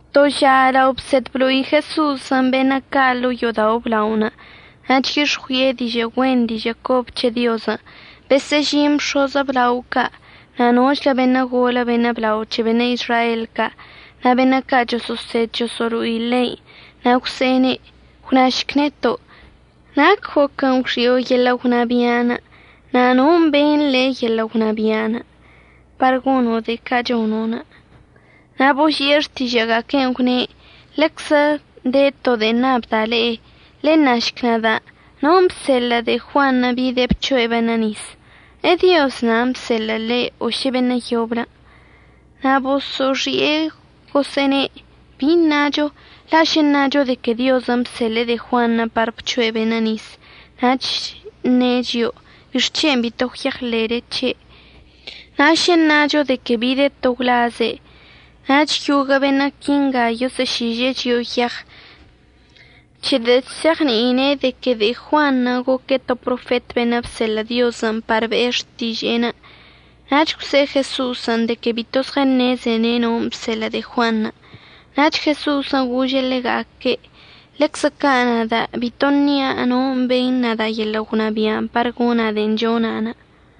To ža lao bsed blo'i Jeso'osən' beṉə' ca' ḻo'o yo'odao' əblaonə' na' chyix̱ɉui'e dižə' güen dižə' cobə c̱he Diozən', besə'əžin bx̱oz əblao ca' na' nochlə beṉə' golə beṉə' blao c̱he beṉə' Izrael ca' na' beṉə' ca' choso'osed choso'olo'i ḻein'. Na' gwse'ene': ―Gwnašc neto', ¿nac goquən' gwxi'o yeḻə' gwnabi'an na' non' beṉ le' yeḻə' gwnabia'anə' par gono' de'e ca' chono'? Na' boži'e xtižə'əga'aquen' gwne': ―Ḻeczə de to de'e ṉabda' le'e, ḻenašc nada', ¿non' bseḻə' de'e Juanṉə' bide' bc̱hoe' beṉə' nis? ¿EDioz nan' bseḻe'ene' o šə beṉə' yoblən'? Na' boso'oxi'e gosə'əne': ―¿Bi ṉacho? La' šə ṉacho de que Diozən' bseḻe'e de'e Juanṉə' par bc̱hoe' beṉə' nis, nach əṉe' chio'o: “¿Bixc̱hen' bito gwyeɉḻe'ele c̱he'?” Na' šə ṉacho de que bide' to gwlazze', nach yoguə' beṉə' quinga yosə'əšiže'e chio'o yeɉ c̱hedə' chse'eɉni'ine' de que de'e Juanṉə' goque' to profet beṉə' bseḻə' Diozən' par be'e xtiže'enə'. Nach gwse'e Jeso'osən' de que bito zɉəṉezene' non' bseḻə' de'e Juanṉə'. Nach Jeso'osən' gože' ḻega'aque': ―Ḻeczə ca' nada' bito əṉia' non' beṉ nada' yeḻə' gwnabia' par gona' de'en chona'.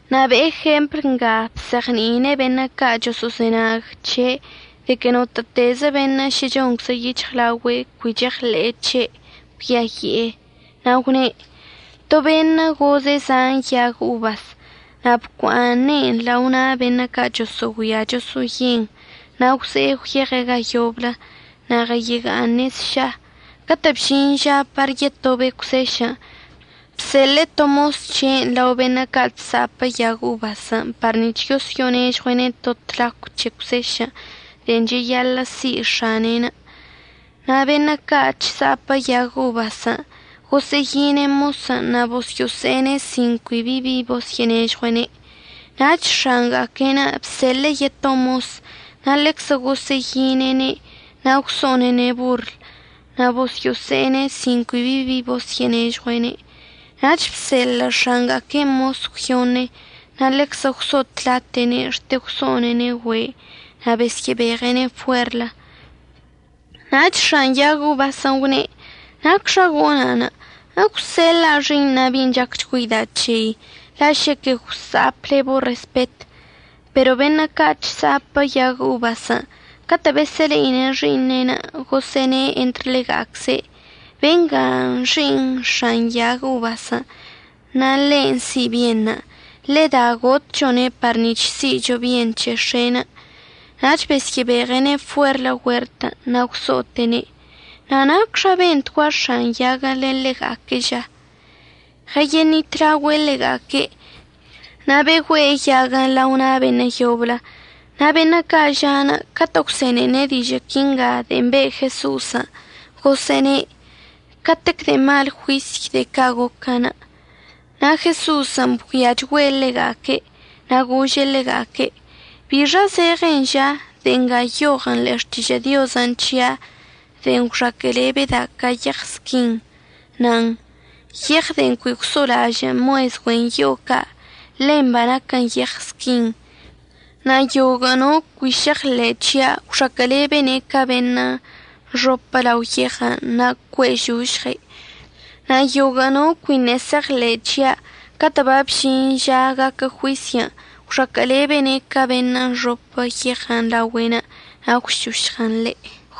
Na' be'e jempl nga bzeɉni'ine' beṉə' ca' choso'ozenag c̱he' de que notə'ətezə beṉə' šə chonczə yic̱hɉlaogüe' cui cheɉḻe'e c̱he' cuiayi'e. Na' gwne': ―To beṉə' goze' zan yag obasən' na' bocua'aṉe'en lao na' beṉə' ca' yoso'ogüia yoso'oye'en, na' gwze'e gwyeɉe' ga yoblə na' ɉəyega'aṉe' sša. Catə' bžin ža par yesyə'ətobe' cwsešən', bseḻe'e to mos c̱he'enə' lao beṉə' ca' chsa'ape' yag obasən' par nic̱h yosyo'onežɉue'ene' to tlacw c̱he cwsešən' de'en cheyaḻə' si' x̱ane'en. Na' beṉə' ca' chsa'apə yag obasən' gosə'əyine' mosən' na' bosyo'ose'ene' sin cui bi bi bosyo'onežɉue'ene'. Nach x̱anga'aque'en bseḻe'e yeto mosən', na' ḻeczə gosə'əyine'ene' na' gwso'one'ene' borl, na' bosyo'ose'ene' sin cui bi bi bosyo'onežɉue'ene'. Nach bseḻə' x̱anga'aquen' mos əgwyoṉe, na' ḻeczə gwso'otlate'ene' xte gwso'onene' güe' na' besyə'əbeɉe'ene' fuerlə. Nach x̱an yag obasən' gwne': “¿Nacxa gona'? Egwseḻa'a xi'iṉa' bi'in chacchgüeida' c̱hei, la' šəquə gwsa'apəlɉe'ebo' respet.” Pero beṉə' ca' chsa'apə yag obasən' catə' besə'əle'ine' xi'iṉe'enə' gosə'əne' entr ḻega'acze': “Bengan' xi'iṉ x̱an yag obasən' na' ḻen' si' bienṉə'. Ḻeda gotchone' par nic̱h si'icho bien c̱he x̱e'enə'.” Nach besyə'əbeɉe'ene' fuerlə güertən' na' gwso'ote'ene'. Na' ¿nacxa bentgua x̱an yaguən' len ḻega'aque'enə' ža? Ɉəyeṉitlaogüe' ḻega'aque', na' begüe'e yaguən' lao na' beṉə' yoblə. Na' beṉə' ca' ža'anə' catə' gwse'enene' dižə' quinga de'en be' Jeso'osən' gosə'əne': ―¡Catec de'e mal juisy de'e ca' goquən'! Na' Jeso'osən' bgüiachgüe' ḻega'aque' na' gože' ḻega'aque': ―¿Bixa zeɉen ža, de'en nga nyoɉən' ḻe'e Xtižə' Diozən' c̱hia' de'en gwxaquə'əlebəda' ca yeɉ squin?, nan: Yeɉ de'en cui gwso'olažə' mues güen yo'o ca', ḻen banaquən yeɉ squin. Na' yoguə' no cui šeɉḻe' c̱hia' gwxaquə'əlebene' ca beṉə' əxopə lao yeɉ na' cue'ežošɉe'. Na' yoguə' no cuiṉə' šeɉḻe' c̱hia' catə' babžin žan' gaquə juisyən', gwxaquə'əlebene' ca beṉə' əxopə yeɉ laogüe'enə' na' əgwšošɉən ḻe'.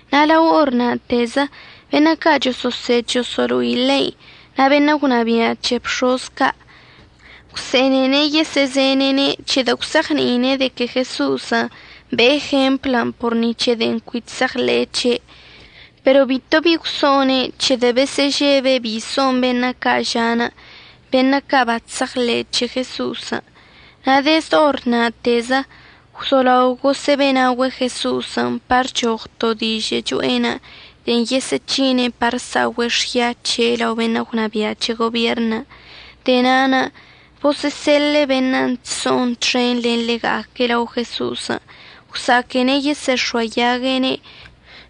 Na' lao or na'atezə beṉə' ca' choso'osed choso'olo'i ḻein' na' beṉə' gwnabia' c̱he bx̱oz ca' gwse'enene' yesə'əzene'ene' c̱hedə' gwse'eɉni'ine' de que Jeso'osən' be'e jemplən' por ni c̱he de'en cui chse'eɉḻe'e c̱he'. Pero bito bi gwso'one' c̱hedə' besə'əžebe' bi so'on beṉə' ca' ža'anə' beṉə' bachse'eɉḻe'e c̱he Jeso'osən'. Na' dezd or na'atezə gwzolao gosə'əbe'enaogüe' Jeso'osən' par əchoɉ to dižə' cho'enə' de'en yesə'əc̱hine' par əsa'ogüe' xya c̱he' lao beṉə' gwnabia' c̱he gobierṉən'. De'e na'anə' bosə'əseḻe'e beṉə' chso'on txen len ḻega'aque' lao Jeso'osən' gwsa'aquene' yesə'əx̱oayague'ene'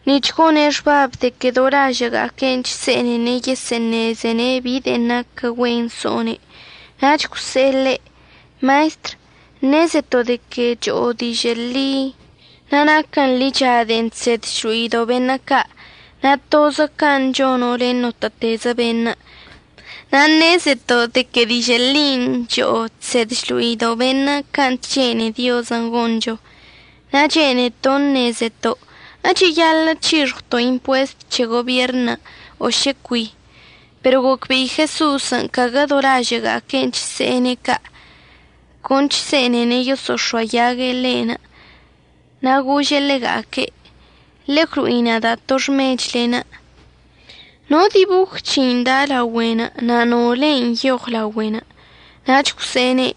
nic̱h gone' xbab de que do lažə'əga'aque' chse'enene' yesə'əṉezene' bi de'en naquən güen so'one'. Nach gwse'e ḻe': ―Maestr, ṉezeto' de que cho'o dižə' ḻi, na' naquən ḻicha de'en chsed chlo'ido' beṉə' ca', na' tozə can' chono' len notə'ətezə beṉə'. Na' ṉezeto' de que dižə' ḻin' cho'o chsed chlo'ido' beṉə' can' chene'e Diozən' goncho. Na' chene'eto' ṉezeto' ¿əcheyaḻə' c̱hixɉwto' impuest c̱he gobierṉən', o šə cui? Pero gocbe'i Jeso'osən' caguə do lažə'əga'aque'enə' chse'ene' ca', con chse'enene' yoso'ox̱oayague' ḻe', na' gože' ḻega'aque': ―Ḻe'e gwlo'i nada' to xmechlen'. ¿No diboj c̱hein' da' laogüen' na' no lein' nyoɉ laogüen'? Nach gwse'ene':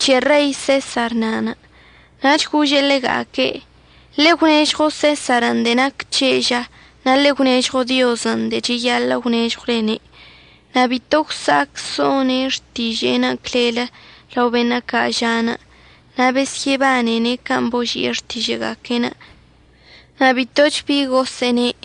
―C̱he Rei Sesar na'anə'. Nach gože' ḻega'aque': ―Ḻe'e əgwnežɉo Sesarən' de'en naquə c̱he' ža, na' ḻe'e əgwnežɉo Diozən' de'en cheyaḻə' əgwnežɉwlene'. Na' bito gwsa'ac so'one' xtiže'enə' clellə lao beṉə' ca' ža'anə', na' besyə'əbanene' can' boži'e xtižə'əga'aque'enə', na' bitoch bi gosə'əne'.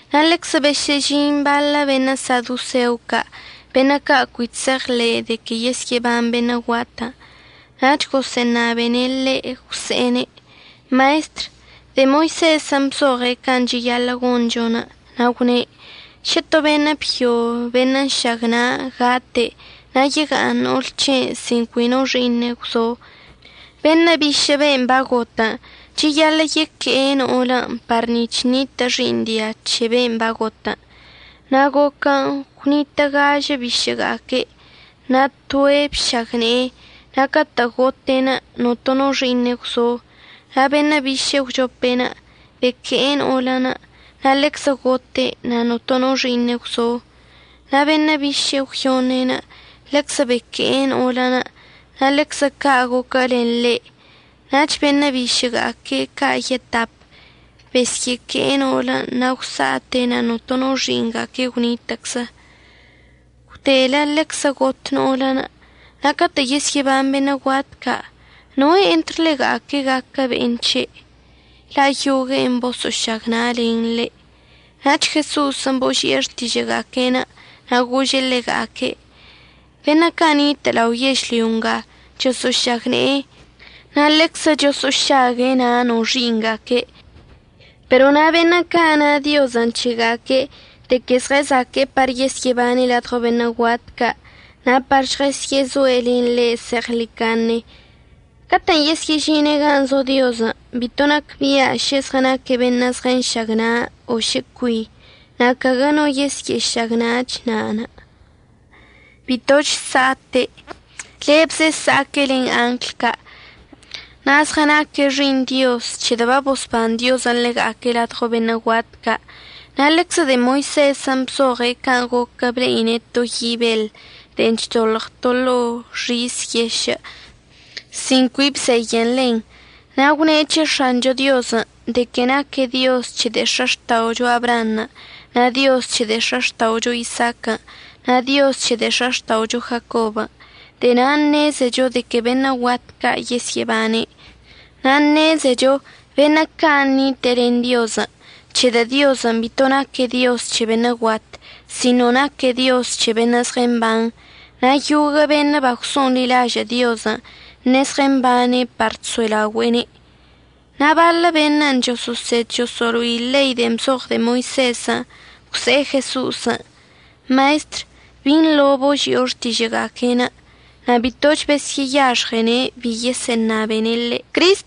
Na' ḻeczə besə'əžin baḻə' beṉə' sadoseo ca' beṉə' ca' cui chse'eɉḻe'e de que yesyə'əban beṉə' guatən', nach gosə'əṉabene' ḻe' gwse'ene': ―Maestr, de'e Moisezən' bzoɉe' can' cheyaḻə' goncho. Na' gwne': “Šə to beṉə' byo beṉə' nšagna' gate' na' yega'aṉ no'ol c̱he'enə' sin cui no xi'iṉe' gwzo, beṉə' bišə' ben' bagotən' cheyaḻə' yeque'e no'olənə' par nic̱h ṉitə' xi'iṉ dia c̱he ben' bagotən'. Na' goquən' gwnitə' gažə bišə'əga'aque', na' toe' bšagne'e na' catə' gote' notono xi'iṉe' gwzo. Na' beṉə' biše'e əgwchope beque'e no'olən', na' ḻeczə gote' na' notono xi'iṉe' gwzo. Na' beṉə' biše'e əgwyoṉe ḻeczə beque'e no'olən', na' ḻeczə ca' goquə len ḻe', nach beṉə' bisə'əga'aque' ca' yetap besyə'əque'e no'olən' na' gwsa'ate' na' notono xi'iṉga'aque' gwnitə'əczə. Gwdelə ḻeczə got no'olən'. Na' catə' yesyə'əban beṉə' guat ca', ¿noe' entr ḻega'aque' gaquə be'en c̱he'? la' yogue'e boso'ošagna'alene' ḻe'. Na' Jeso'osən' boži'e xtižə'əga'aque'enə' na' gože' ḻega'aque': ―Beṉə' ca' nitə' lao yežlyo nga chosə'əšagne'e na' ḻeczə choso'ošague' na' no xi'iṉga'aque'. Pero na' beṉə' ca' na Diozən' c̱hega'aque' de que zɉəzaque'e par yesyə'əbane' ladɉo beṉə' guat ca' na' par žɉəsyə'əzoe' len ḻe' zeɉḻicaṉe, catə'ən yesyə'əžine' gan' zo Diozən' bito nacbia' šə zɉənaque' beṉə' zɉənšagna' o šə cui, na' caguə no yesyə'əšagna'ach na'anə'. Bitoch sa'ate'. Lebze əsa'aque' len angl ca'. Na' zɉənaque' xi'iṉ Dioz c̱hedə' babosban Diozən' ḻega'aque' ladɉo beṉə' guat ca'. Na' ḻeczə de'e Moisezən' bzoɉe' can' goquə ble'ine' to yi' beḻ de'e chdoḻɉən to ḻo'o xis yešə' sin cui bzeyən ḻen. Na' gwne' c̱he X̱ancho Diozən' de que naque' Dioz c̱he de'e x̱axta'ocho Abraanṉə', na' Dioz c̱he de'e x̱axta'ocho Isaaquən' na' Dioz c̱he de'e x̱axta'ocho Jacobən'. De'e na'anə' ṉezecho de que beṉə' guat ca' yesyə'əbane'. Na' ṉezecho beṉə' ca' nite'e len Diozən' c̱hedə' Diozən' bito naque' Dioz c̱he beṉə' guat, sino naque' Dioz c̱he beṉə' zɉəmban. Na' yoguə' beṉə' bagwso'onḻilažə' Diozən' ṉe'e zɉəmbane' par chso'elaogüe'ene'. Na' baḻə beṉə' choso'osed choso'olo'ine' ḻei de'en bzoɉ de'e Moisezən' gwse'e Jeso'osən': ―Maestr, binḻo boži'o xtižə'əga'aque'enə'. Na' bitoch besyə'əyaxɉene' ¡bi yesə'əṉabene' ḻe'.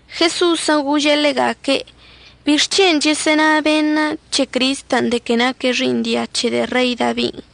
Jeso'osən' gože' ḻega'aque': ―¿Bixc̱hen' chəsə'əna beṉə' c̱he Cristən' de que naque' xi'iṉ dia c̱he de'e Rei Dabin'?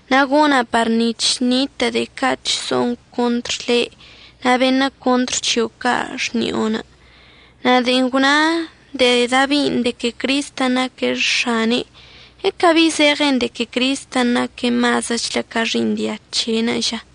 Na' gona' par nic̱h ṉitə' de'e ca' chso'on contr le' na' beṉə' contr c̱hio' ca' xni'onə'.” Na' de'en gwna de'e Dabin' de que Cristən' naque' X̱ane', ¿əcabi zeɉen de que Cristən' naque' mazəchlə ca xi'iṉ dia c̱he'enə' ža?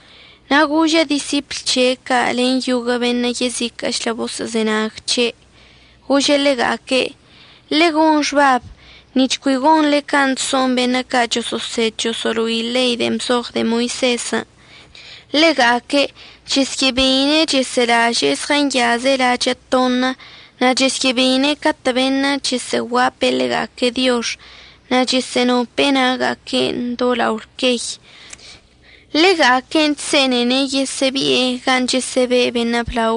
Na' gože' disipl c̱he' ca' len yoguə' beṉə' yeziquə'əchlə boso'ozenag c̱he', gože' ḻega'aque': ―Ḻe'e gon xbab nic̱h cui gonḻe can' chso'on beṉə' ca' choso'osed choso'olo'ine' ḻei de'en bzoɉ de'e Moisezən'. Ḻega'aque' chesyə'əbeine' chəsə'əlaže'e zɉənyaze' lachə' toṉə, na' chesyə'əbeine' catə' beṉə' chəsə'əguape' ḻega'aque' diox na' chəsə'ənope'e na'aga'aque'enə' do lao lquey. Ḻega'aque' chse'enene' yesə'əbi'e gan' chəsə'əbe' beṉə' blao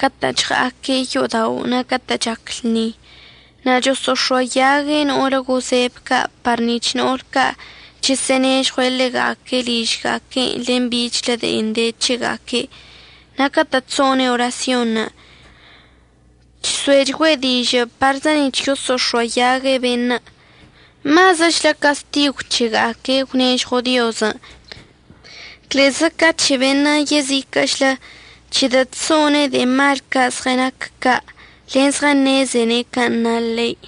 catə' chɉa'aque' yo'odao' na' catə' chac lṉi. Na' choso'ox̱oayague' no'olə gozebə ca' par nic̱h no'ol ca' chəsə'ənežɉue' ḻega'aque' ližga'aque' len bichlə de'en de c̱hega'aque'. Na' catə' chso'one' orasyon, chso'echgüe' dižə' parzə nic̱h choso'ox̱oayague' beṉə'. Mazəchlə castigw c̱hega'aque' əgwnežɉo Diozən' clezə ca c̱he beṉə' yeziquə'əchlə c̱hedə' chso'one' de'e mal ca' zɉənac ca' len zɉəṉezene' can' na ḻein'.